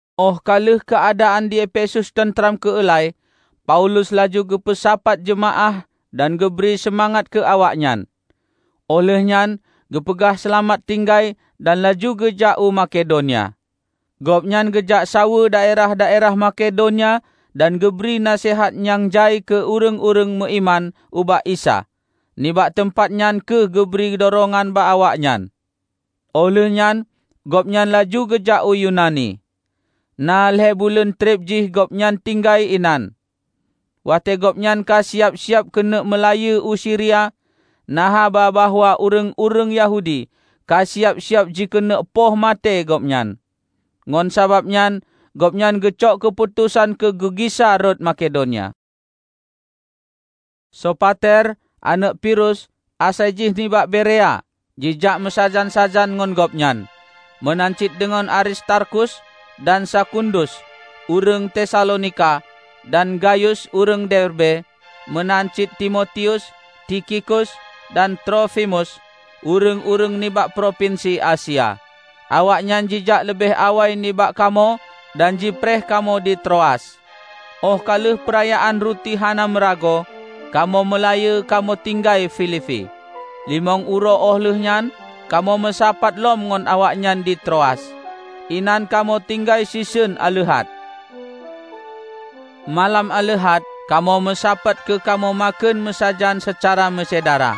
Óh ka lheueh keuadaan di Efesus teuntram keula-i, Paulus laju geupeusapat jeumaáh dan geubri seumangat keu awaknyan. Óh lheueh nyan geupeugah seulamat tinggai dan laju geujak u Makedonia. Gobnyan geujak saweue daerah-daerah Makedonia dan geubri naseuhat nyang jai keu ureuëng-ureuëng meuiman ubak Isa nibak teumpat nyan keu geubri durongan bak awaknyan. Óh lheueh nyan gobnyan laju geujak u Yunani. Na lhée buleuen treb jih gobnyan tinggai inan. Watée gobnyan ka siab-siab keuneuk meulayeue u Siria, na haba bahwa ureuëng-ureuëng Yahudi ka siab-siab jikeuneuk poh maté gobnyan. Ngon sabab nyan gobnyan geucok keuputosan keu geugisa rot Makedonia. Sopater aneuëk Pirus asai jih nibak Berea jijak meusajan-sajan ngon gobnyan; meunan cit deungon Aristarkus dan Sekundus ureuëng Tesalonika, dan Gayus ureuëng Derbe. Meunan cit Timotius, Tikhikus dan Trofimus, ureuëng-ureuëng nibak propinsi Asia. Awaknyan jijak leubeh awai nibak kamoe dan jipreh kamoe di Troas. Óh ka lheueh Peurayaan Ruti Hana Meuragoe, kamoe meulayeue kamoe tinggai Filipi. Limong uroe óh lheueh nyan kamoe meusapat lom ngon awaknyan di Troas. Inan kamoe tinggai siseun aleuhat. Malam aleuhat kamoe meusapat keu kamoe makheun meusajan seucara meusyedara.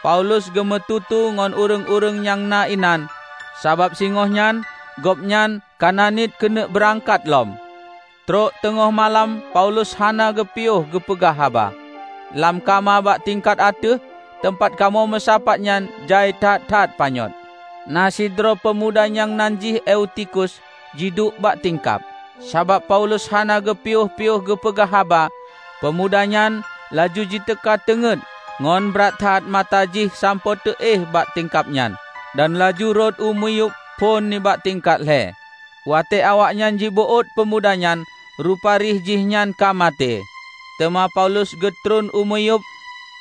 Paulus geumeututoe ngon ureuëng-ureuëng nyang na inan, sabab singoh nyan gobnyan ka na niet keuneuk beurangkat lom. Trok teungoh malam Paulus hana geupiôh geupeugah haba. Lam kama bak tingkat ateueh, teumpat kamoe meusapat nyan jai that-that panyöt. Na sidroe peumuda nyang nan jih Eutikhus jiduek bak tingkab. Sabab Paulus hana geupiôh-piôh geupeugah haba, peumuda nyan laju jiteuka teungét ngon brat that mata jih sampoe teuéh bak tingkab nyan, dan laju rhot u miyueb phon nibak tingkat lhée. Watée awaknyan jibeuôt peumuda nyan, rupari jihnyan ka maté. Teuma Paulus geutreun u miyueb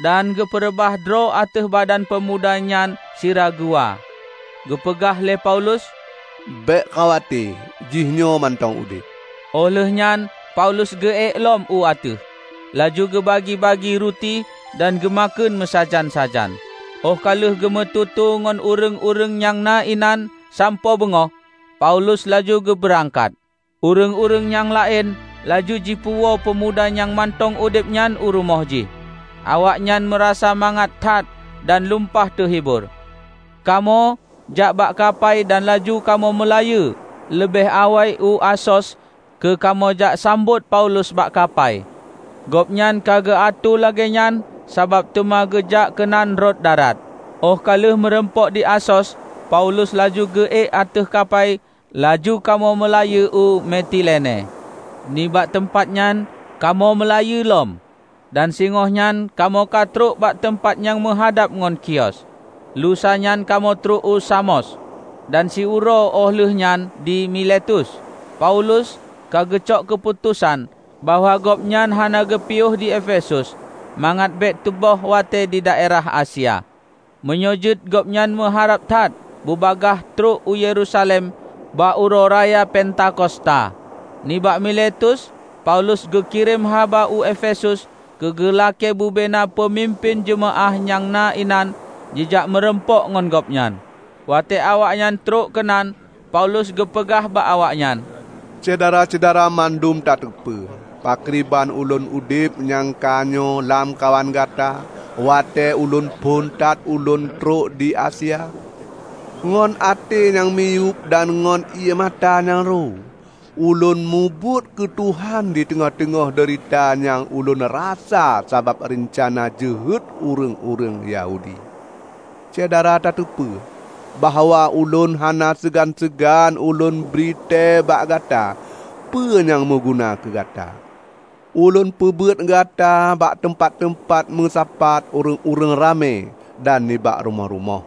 dan geupeureubah droe ateueh badan peumuda nyan sira geuwa. Geupeugah lé Paulus, "Bék khawate, jihnyoe mantong udeb!" Óh lheueh nyan Paulus geuék lom u ateueh, laju geubagi-bagi ruti dan geumakheun meusajan-sajan. Óh ka lheueh geumeututoe ngon ureuëng-ureuëng nyang na inan sampoe beungoh, Paulus laju geubeurangkat. Ureuëng-ureuëng nyang laén laju jipeuwoe peumuda nyang mantong udeb nyan u rumoh jih. Awaknyan meurasa mangat that dan lumpah teuhibor. Kamoe jak bak kapai dan laju kamoe meulayeue leubeh awai u Asos keu kamoe jak sambot Paulus bak kapai. Gobnyan ka geuatoe lagée nyan sabab teuma geujak keunan rot darat. Óh ka lheueh meurumpok di Asos, Paulus laju geuék ateueh kapai laju kamoe meulayeue u Metilene. Nibak teumpat nyan kamoe meulayeue lom, dan singoh nyan kamoe ka trok bak teumpat nyang meuhadab ngon Khios. Lusa nyan kamoe trok u Samos dan siuroe óh lheueh nyan di Miletus. Paulus ka geucok keuputosan bahwa gobnyan hana geupiôh di Efesus, mangat bék teuboh watée didaerah Asia. Meunyoe jeuet gobnyan meuharab that bubagaih trok u Yerusalem bak uroe raya Pentakosta. Nibak Miletus Paulus geukirém haba u Efesus keu geulakée bubena peumimpén jeumaáh nyang na inan jijak meurumpok ngon gobnyan. Watée awaknyan trok keunan, Paulus geupeugah bak awaknyan, "Syedara-syedara mandum tateupeue pakriban ulôn udeb nyang ka nyoe lamkawan gata watée uroe phon that ulôn trok di Asia. Ngon até nyang miyueb dan ngon ié mata nyang ro, ulôn mubuet keu Tuhan di teungoh-teungoh deurita nyang ulôn rasa sabab reuncana jeuhet ureuëng-ureuëng Yahudi. Syedara tateupeue bahwa ulôn hana seugan-seugan ulôn bri thée bak gata peue nyang meuguna keu gata. Ulôn peubeuet gata bak teumpat-teumpat meusapat ureuëng ramé dan nibak rumoh-rumoh.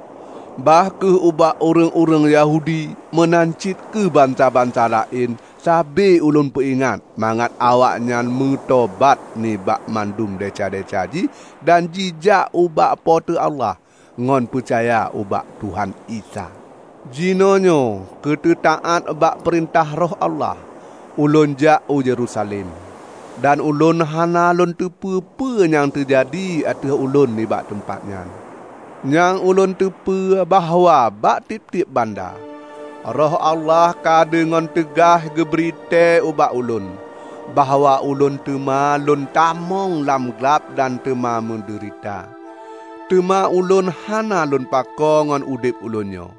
Bah kheueh ubak ureuëng-ureuëng Yahudi meunan cit keu bansa-bansa laén sabe ulôn peuingat mangat awaknyan jimeutobat nibak mandum desya-desya jih dan jijak ubak Po teu Allah, ngon peucaya ubak Tuhan Isa. Jinoenyoe keu teutaát bak perintah Roh Allah, ulôn jak u Yerusalem. Dan ulôn hana lôn teupeu peue nyang teujadi ateueh ulôn nibak teumpat nyan. Nyang ulôn teupeu bahwa bak tieb-tieb banda, Roh Allah ka deungon teugaih geubri tée ubak ulôn, bahwa ulôn teuma lôn tamong lam glab dan teuma meudeurita. Teuma ulôn hana lôn pakoe ngon udeb ulôn nyoe,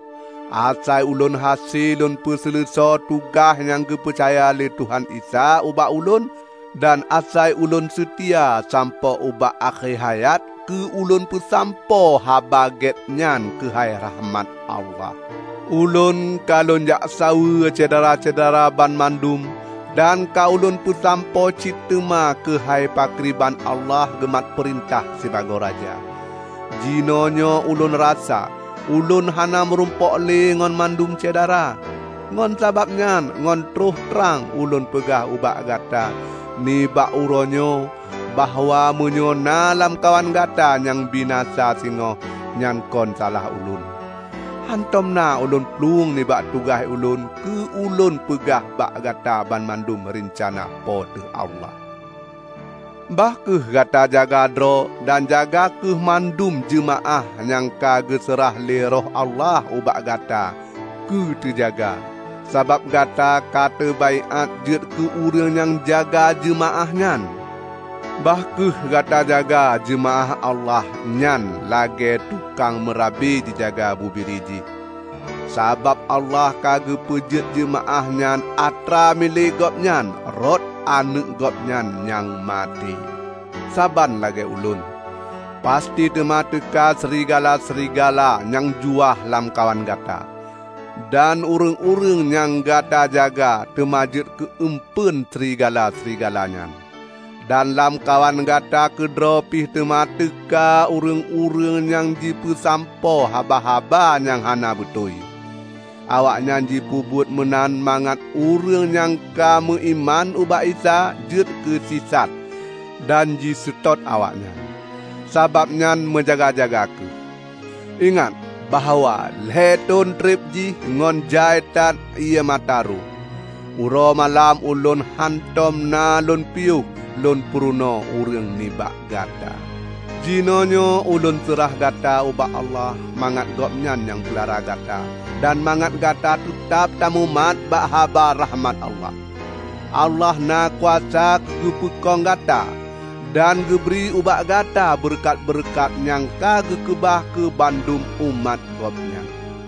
asai ulôn hase lôn peuseuleusoe tugaih nyang geupeucaya lé Tuhan Isa ubak ulôn dan asai ulôn seutia sampoe ubak akhé hayat keu ulôn peusampoe Haba Gét nyan keuhai rakhmat Allah. Ulôn ka lôn jak saweue syedara-syedara banmandum dan ka ulôn peusampoe cit teuma keuhai pakriban Allah geumat peurintah sibagoe Raja. Jinoenyoe ulôn rasa ulôn hana meurumpok le ngon mandum syedara. Ngon sabab nyan ngon troh trang ulôn peugah ubak gata nibak uroe nyoe bahwa meunyoe na lamkawan gata nyang binasa singoh, nyan kon salah ulôn. Hántom na ulôn plueng nibak tugaih ulôn keu ulôn peugah bak gata banmandum reuncana Po teu Allah. Bah kheueh gata jaga droe dan jaga kheueh mandum jeumaáh nyang ka geuseurah lé Roh Allah ubak gata keu teujaga; sabab gata ka teubaiát jeuet keu nyang jaga jeumaáh nyan. Bah kheueh gata jaga jeumaáh Allah nyan lagée tukang meurabe jijaga bubiri jih, sabab Allah ka geupeujeuet jeumaáh nyan atra milék Gobnyan rot Aneuëk Gobnyan nyang maté. Saban lagée ulôn, pasti teuma teuka srigala-srigala nyang juah lamkawan gata. Dan ureuëng-ureuëng nyang gata jaga teuma jeuet keu eumpeuen srigala-srigala nyan. Dan lamkawan gata keudroe pih teuma teuka ureuëng-ureuëng nyang jipeusampoe haba-haba nyang hana beutôi. Awaknyan jipeubuet meunan mangat ureuëng nyang ka meuiman ubak Isa jeuet keu sisat dan jiseutôt awaknyan. Sabab nyan meujaga-jaga kheueh! Ingat bahwa lhée thon treb jih ngon jai that ié mata ro, uroe malam ulôn hántom na lôn piôh lôn purunoe ureuëng nibak gata. Jinoenyoe ulôn seurah gata ubak Allah mangat Gobnyan nyang peulara gata dan mangat gata teutab tamumat bak haba rakhmat Allah. Allah na kuasa keu geupeukong gata dan geubri ubak gata beureukat-beureukat nyang ka geukeubah keu banmandum umat gobnyan.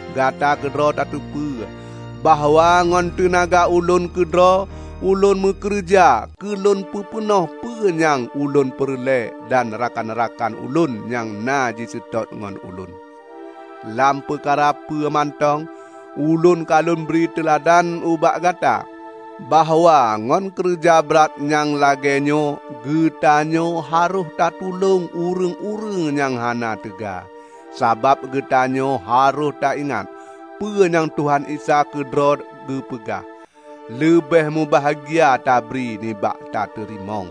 Gata keudroe tateupeue, bahwa ngon teunaga ulôn keudroe ulôn meukeureuja keu lôn peupeunoh peue nyang ulôn peureulée dan rakan-rakan ulôn nyang na jiseutôt ngon ulôn. Lam peukara peue mantong ulôn ka lôn bri teuladan ubak gata bahwa ngon keureuja brat nyang lagée nyoe geutanyoe harôh tatulông ureuëng-ureuëng nyang hana teuga. Sabab geutanyoe harôh taingat peue nyang Tuhan Isa keudroe geupeugah, 'Leubeh mubahgia tabri nibak tateurimong.' "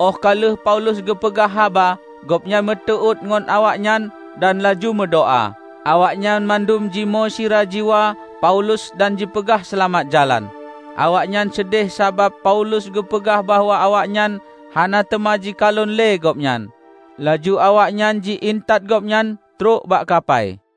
Óh ka lheueh Paulus geupeugah haba, gobnyan meuteuôt ngon awaknyan dan laju meudoá. Awaknyan mandum jimoe sira jiwa Paulus dan jipeugah seulamat jalan. Awaknyan seudeh sabab Paulus geupeugah bahwa awaknyan hana teuma jikalon le gobnyan. Laju awaknyan ji intat gobnyan trok bak kapai.